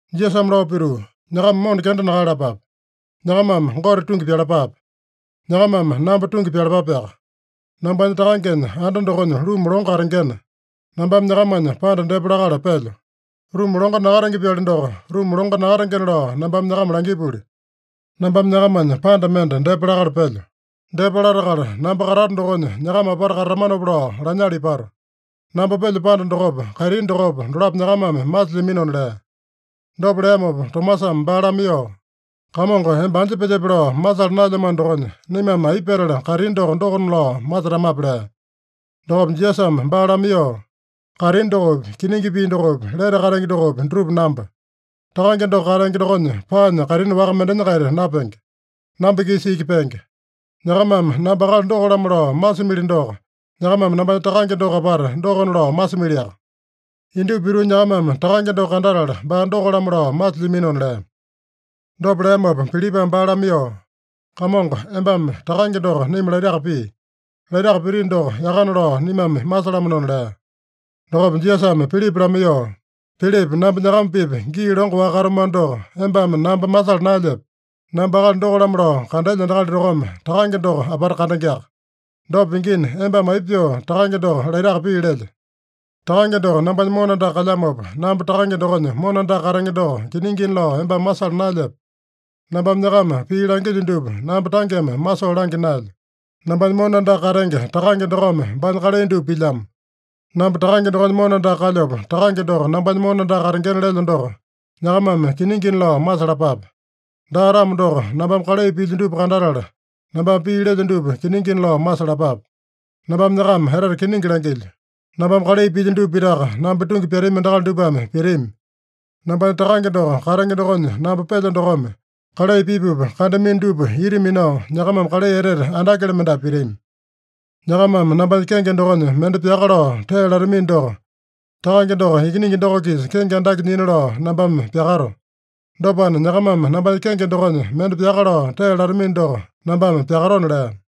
Jisasame lao pituu, “Nyakama mona kenda nakaeyalapape. Nyakamame Gote tungi pyalapape. Nyakamame namba tungi pyalapapeaka. Nambanya Takangenya anda dokonya ruma longo katengena, nambame nyakamanya panda depa lakala pelyo. Ruma longo nakatenge-pyali doko, ruma longo nakatengena lao nambame nyakama langipuli. Nambame nyakamanya panda mende depa lakala pelyo. Depa latakala namba katato dokonya nyakama apata katatamanopa lao lanyala ipato. Namba pelyo panda dokopa, kaitini dokopa, dolapo nyakamame masilyaminona” lea. Dopa leamopa Tomasame baa lamaiyoo, “Kamongo, emba anja pelyepe lao masala naelyamano dokonya, naimame aipa petala kaitini doko, dokona lao masetamape?” lea. Dokopa Jisasame baa lamaiyoo, “Kaitini dokopi, kiningi pii dokopi, lete katenge dokopi, dutupa namba. Takange doko katenge dokonya paanya kaitini waka mendenya-kaita napenge. Namba-kisa iki penge. Nyakamame namba akali doko-lamo lao masimili doko, nyakamame nambanya Takange doko apata dokona lao masimiliaka. Indupa pituu nyakamame Takange doko kandatala baa doko-lamo lao masilyaminona” lea. Dopa leamopa Pilipame baa lamaiyoo, “Kamongo, embame Takange doko naima laitaka pii. Laitaka pitino doko yakana lao naimame masalamanona” lea. Dokopa Jisasame Pilipa lamaiyoo, “Pilipa, namba nyakama-pipa gii longo-waka katamano doko, embame namba masala naelyepe? Namba akali doko-lamo lao kandelya endakali dokome Takange doko apata kandengeaka. Dopa pingina, embame aipa pyoo Takange doko laitaka pii lelye? Takange doko nambanya mona andaka kalyamopa, namba Takange dokonya mona andaka katenge doko kiningina lao embame masala naelyepe? Nambame nyakama pii langilyo dupa, namba tangeme masoo langya naelyo. Nambanya mona andaka katenge Takange dokome baanya kalai dupa pilyamo. Namba Takange dokonya mona andaka kalyopa, Takange doko nambanya mona andaka katengena lelyo doko, nyakamame kiningina lao masalapape. Daa-tamo doko, nambame kalai pilyo dupa kandatala, nambame pii lelyo dupa kiningina lao masalapape. Nambame nyakama etete kiningi langilyo: Nambame kalai pilyo dupa pitaka namba tungi pyatami endakali dupame pitami. Nambanya Takange doko katenge dokonya namba pelyo dokome, kalai pipupa kandamino dupa ita minao, nyakamame kalai etete andakele mendapu pitami. Nyakamame nambanya kenge dokonya mende pyaka lao tee latamino doko, Takange doko Ikiningi doko-kisa kenge andake nyina lao nambame pyakato. Dopana, nyakamame nambanya kenge dokonya mende pyaka lao tee latamino doko nambame pyakatona” lea.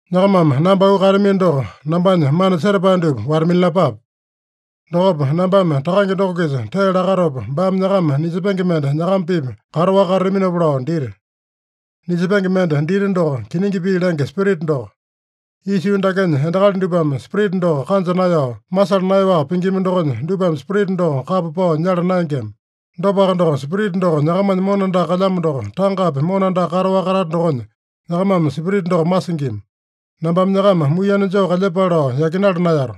“Nyakamame namba auu kaeyatamino doko, nambanya mana setapae dupa wata-minalapape. Dokopa nambame Takange doko-kisa tee lakatopa, baame nyakama Nisepenge mende nyakama-pipa kataowaka katataminopa lao dita. Nisepenge mende dita doko, kiningi pii lenge Spirita doko. Isa yuu dakenya endakali dupame Spirita doko kanja naeyao, masala naeyaowaka pingima dokonya, dupame Spirita doko kapa pao nyala naengema. Dopaka doko, Spirita doko nyakamanya mona andaka kalyamo doko, tangapi mona andaka kataowaka katata dokonya, nyakamame Spirita doko masingima. “Nambame nyakama muiyene joo kalyepale lao yakinala naeyato.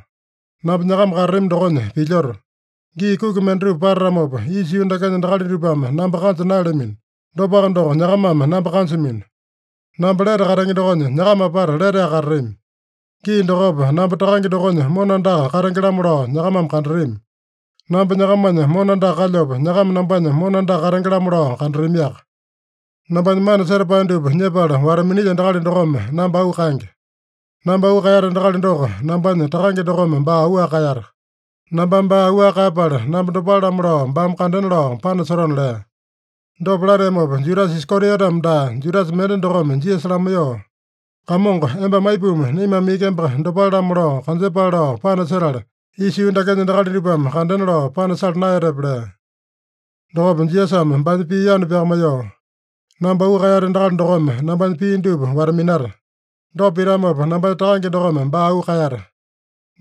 Namba nyakama katatami dokonya pilyoto. Gii kuki mendatupa patatamopa, isa yuu dakenya endakali dupame namba kanja naeyalamino. Dopaka doko, nyakamame namba kanjamino. Namba lete katenge dokonya nyakama apata leteaka katatami. Gii dokopa, namba Takange dokonya mona andaka katenge-lamo lao nyakamame kandatami. Namba nyakamanya mona andaka kalyopa, nyakama nambanya mona andaka katenge-lamo lao kandatamiaka. Nambanya mana setapae dupa nyepala wata-minilya endakali dokome namba auu kaenge. Namba auu kaeyata endakali doko, nambanya Takange dokome baa auwaka kaeyata. Nambame baa auwaka kaeyapala, namba dopale-lamo lao baame kandena lao panasotona” lea. Dopa lateamopa Judasa Iskariotame daa, Judasa mende dokome Jisasa lamaiyoo, “Kamongo, embame aipuma naimame iki emba dopale-lamo lao kanjepale lao panasetala, isa yuu dakenya endakali dupame kandena lao panasala naeyatepe?” lea. Dokopa Jisasame baanya pii yanu pyakamaiyoo, “Namba auu kaeyata endakali dokome nambanya pii dupa wata-minata. Dopa pitamopa nambanya Takange dokome baa auu kaeyata.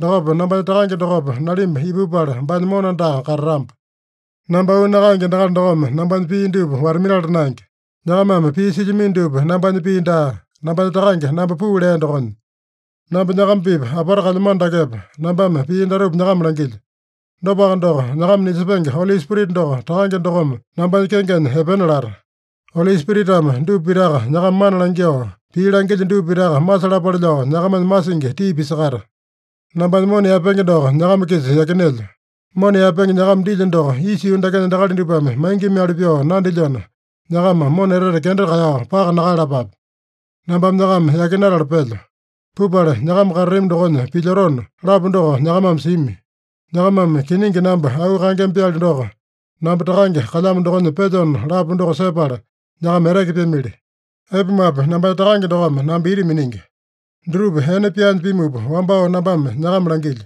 Dokopa nambanya Takange dokopa nalimba ipupala baanya mona andaka katatamba. Namba auu nakaenge endakali dokome nambanya pii dupa wata-minala naenge. Nyakamame pii silyamino dupa nambanya pii daa, nambanya Takange namba puu lea dokonya. “Namba nyakama-pipa apata kalyamano dakepa, nambame pii datupa nyakama langilyo. Dopaka doko, nyakama Nisepenge Oli Spirita doko Takange dokome nambanya kengenya epena lata. Oli Spiritame dupa pitaka nyakama mana langyoo, pii langilyo dupa pitaka masalapale lao nyakamanya masingi tii pisakata. Nambanya mona yaepenge doko nyakama-kisa yakinelyo. Mona yaepenge nyakama dilyo doko isa yuu dakenya endakali dupame maingimali pyoo nandilyona, nyakama mona etete kenda kaeyao paka nakaeyalapape. ‘Nambame nyakama yakinatala pelyo. Pupala nyakama katatami dokonya pilyotona’ lapu doko nyakamame simi. Nyakamame kiningi namba auu kaengema-pyali doko, ‘Namba Takange kalyamo dokonya pelyona’ lapu doko sepala, nyakama eteke pyamili. Aipumape, nambanya Takange dokome namba ita miningi. Dutupa ene pyaanya pimupa wambao nambame nyakama langilyo.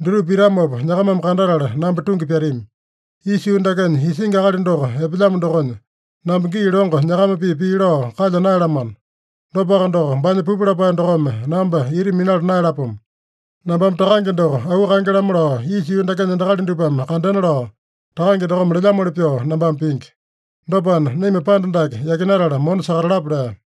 Dutupa pitamopa nyakamame kandatala namba tungi pyatami. Isa yuu dakenya isingi akali doko epelyamo dokonya, namba gii longo nyakama-pipa pii lao kalya naeyalamano. Dopaka doko, baanya pupu lapae dokome namba ita minala naeyalapomo. Nambame Takange doko auu kaenge-lamo lao isa yuu dakenya endakali dupame kandena lao, Takange dokome lelyamoli pyoo nambame pingi. Dopana, naima panda dake yakinatala mona sakatalapa” lea.